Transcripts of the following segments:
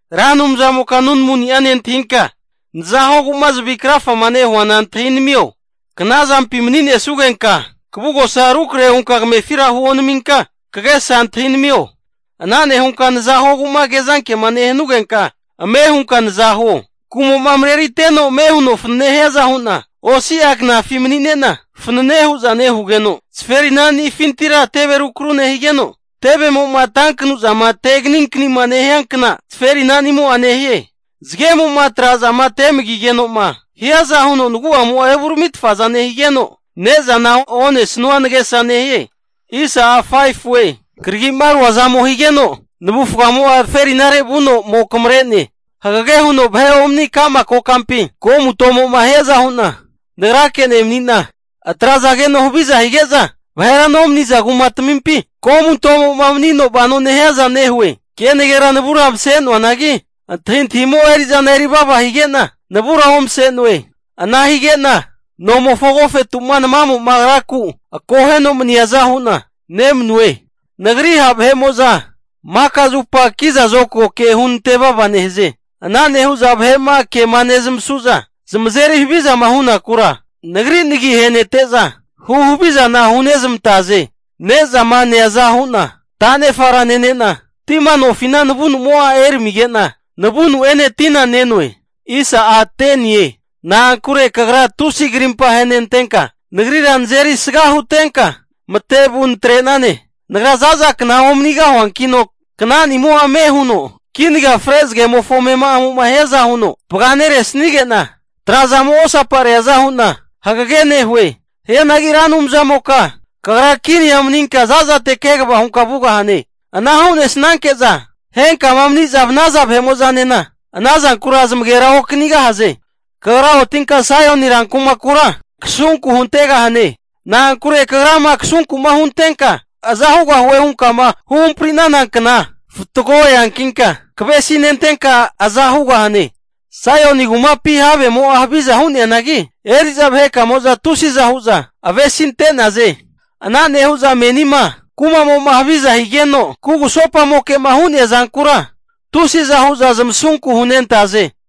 Ra Anumzamoka nunamuni'a nentahinka, naza huogu'ma zavi krafama nehuana antahinamio. Kna zampima mani'nesugenka, kavugosa rukrahe hunka kamefira huonaminka, kagesa antahinamio. Ana nehunka naza huogu'ma kezankema nehanugenka, ame hunka naza huo. Kumo'ma mareriteno ame huno fanane hiaza hu'na osi'a knafi mani'nena fanane hu'za nehugeno, zaferinanifintira teve rukru nehigeno, tevemo'ma tankanu'zama teganinkani nehiankna zaferinanimo'a nehie. Zagemo'ma trazama temagigeno'ma hiaza huno nagu'amo'a evuramitfaza nehige'na, ne'zana onesanua nagesa nehie. Karagi'ma ruazamo higeno, navufgamo'a zaferinare vuno ome kamare'ne. Hagege huno vahe omani ka'ma kokampi komutomo'ma hiaza hu'na nagrake nemani'na, atrazageno haviza hige'za vahera nomaniza kumatamimpi, komutomo'ma manino vano hiaza nehue. Kenagera navura mase'noanagi, antahintahimo'a eri'zana erivava hige'na, navura omase'noe. Ana hige'na nomofo agofetu'ma namamo agraku akoheno maniaza hu'na nemanue. Nagri ha' vahe'mo'za maka zupa kiza zokago ke hunantevava nehaze. Ana nehu'za vahe'ma kema nezamasu'za zamazeri havizama hunakura, nagri nagi ahenente'za hu havizana hunezmantaze. Ne'zama neaza hu'na ta'nefara nene'na, tima nofina navunumo'a eramige'na, navunu'ene tina ne'noe. Na'ankure kagra tusi krimpa ahenantenka, nagrira nazeri sga hutenka matevu natre'nane. Nagra za'za kna omanigahuankino knanimo'a ame huno kinaga fre zagemofo amema'amo'ma hiaza huno vaga neresnige'na, trazamo osapareaza hu'na hagege nehue. Hianagi Ra Anumzamoka kagra kinia maninka za'zate kegava hunka vugahane. Ana hu'nesnanke'za henkama mani'za vanaza vahe'mo'zanena ana zankura zamagera okanigahaze. Kagra otinka Saioni rankumakura kasunku huntegahane. Na'ankure kagrama kasunku'ma huntenka aza hugahue hunkama huhampri'nana kna fatgo eankinka, kavesinentenka aza hugahane. Saioni kumapi havemo'a haviza hu'neanagi, eri'za vahekamo'za tusiza hu'za avesinte'naze. Ana nehu'za menima kumamo'ma haviza higeno kugusopa moke'ma hu'nea zankura, tusiza hu'za zamasunku hunentaze.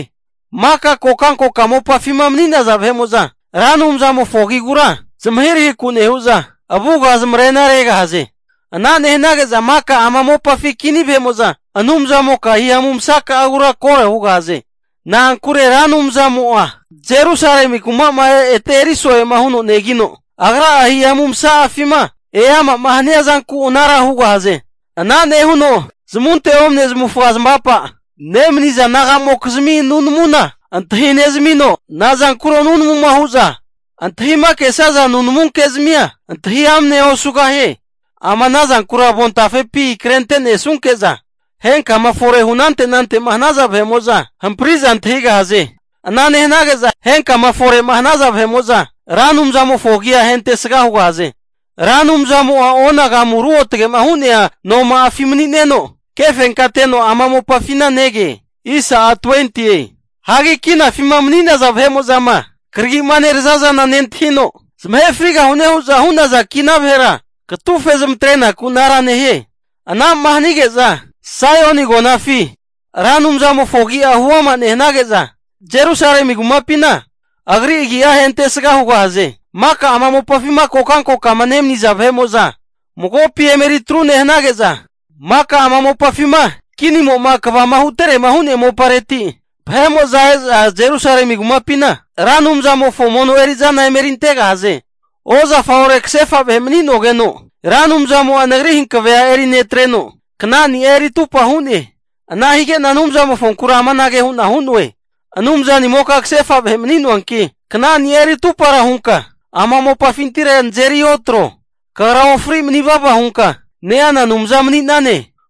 Maka kokankoka mopafima mani'naza vahe'mo'za Ra Anumzamofo agigura zamahirahiku nehu'za, avuga zamarena regahaze. Ana nehanage'za maka ama mopafi kini vahe'mo'za Anumzamoka hihamu masaka'agura koro hugahaze. Na'ankure Ra Anumzamo'a Jerusalemi kuma'ma ete eri so'ema huno negino, Agra'a hihamu masa'afima eama'ma hania zanku anara hugahaze. Ana nehuno zamunte omane zamavufaga zamavapa nemaniza nagamokizmi nunamuna antahi nezamino, nazankuro nunamuma hu'za antahima kesaza nunamu kezmia antahi amnea osugahie. Ama ana zankura avontafepi krente'ne sanunke'za henkama fore hu anante anante'ma hanaza vahe'mo'za hampari'za antahigahaze. Ana nehanage'za henkama fore'ma hanaza vahe'mo'za Ra Anumzamofo agi'a ahentesga hugahaze. Ra Anumzamo'a onagamu ruotgema hu'nea noma'afi mani'neno, kefenkateno ama mopafina nege. Hagi kinafima mani'naza vahe'mo'zama karagi'ma nerazazana nentahino, zamahe frigahune hu'za hu'naza kina vahera katufe zamatre'naku anara nehie. Ana'ma hanige'za Saioni agonafina Ra Anumzamofo agi'a huama nehanage'za, Jerusalemi kumapina agri agia ahentesga hugahaze. Maka ama mopafima kokankokama nemaniza vahe'mo'za, magopi eme eritru nehanage'za, maka ama mopafima kinimo'ma kvama huterema hu'nea mopareti e'za Jerusalemi kumapina Ra Anumzamofo mono eri'zana emerintegahaze. Ozafa ore kasefa vahe mani'nogeno, Ra Anumzamo'a nagri hankavea eri netreno, knani'a eri atupa hu'ne. Ana higena Anumzamofonkura amanage hu'na hu'noe. Anumzanimoka kasefa vahe mani'noanki, knani'a eri atupara hunka ama mopafintira nazeri otro. Kagra ofri manivava hunka neana Anumza mani'nane.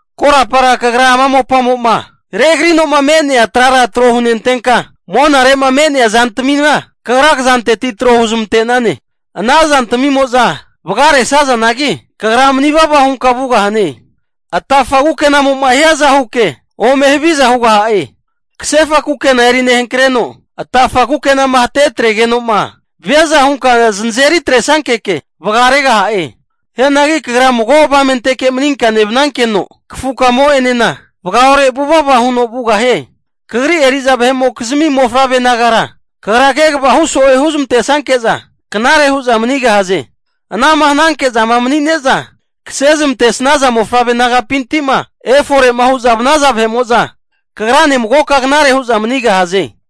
Korapara Kagra ama mopamo'ma regrino'ma me'nia trara tro hunentenka, monare'ma me'nea zantamina Kagra kazanteti tro huzmante'nane. Ana zantamimo'za vagaresazanagi, Kagra manivava hunka vugahane. Atafa kukenamo'ma hiaza huke ome haviza hugaha'e. Kasefa kukena eri nehankreno atafa kukenama hate atregeno'ma viaza hunka zanazeri atresankeke vagaregaha'e. Hianagi Kagra mago avamenteke maninka nevnankeno, kafu kamo'enena vagaore vuvava huno vugahie. Kagri eri'za vahe'mokzimi mofavre nagara, Kagra kegava hu so'e huzmante'snanke'za knare hu'za manigahaze. Ana'ma hananke'zama manine'za kase zamantesnaza mofavre nagapinti'ma efore'ma hu'za vnaza vahe'mo'za, kagrane magoka knare hu'za manigahaze.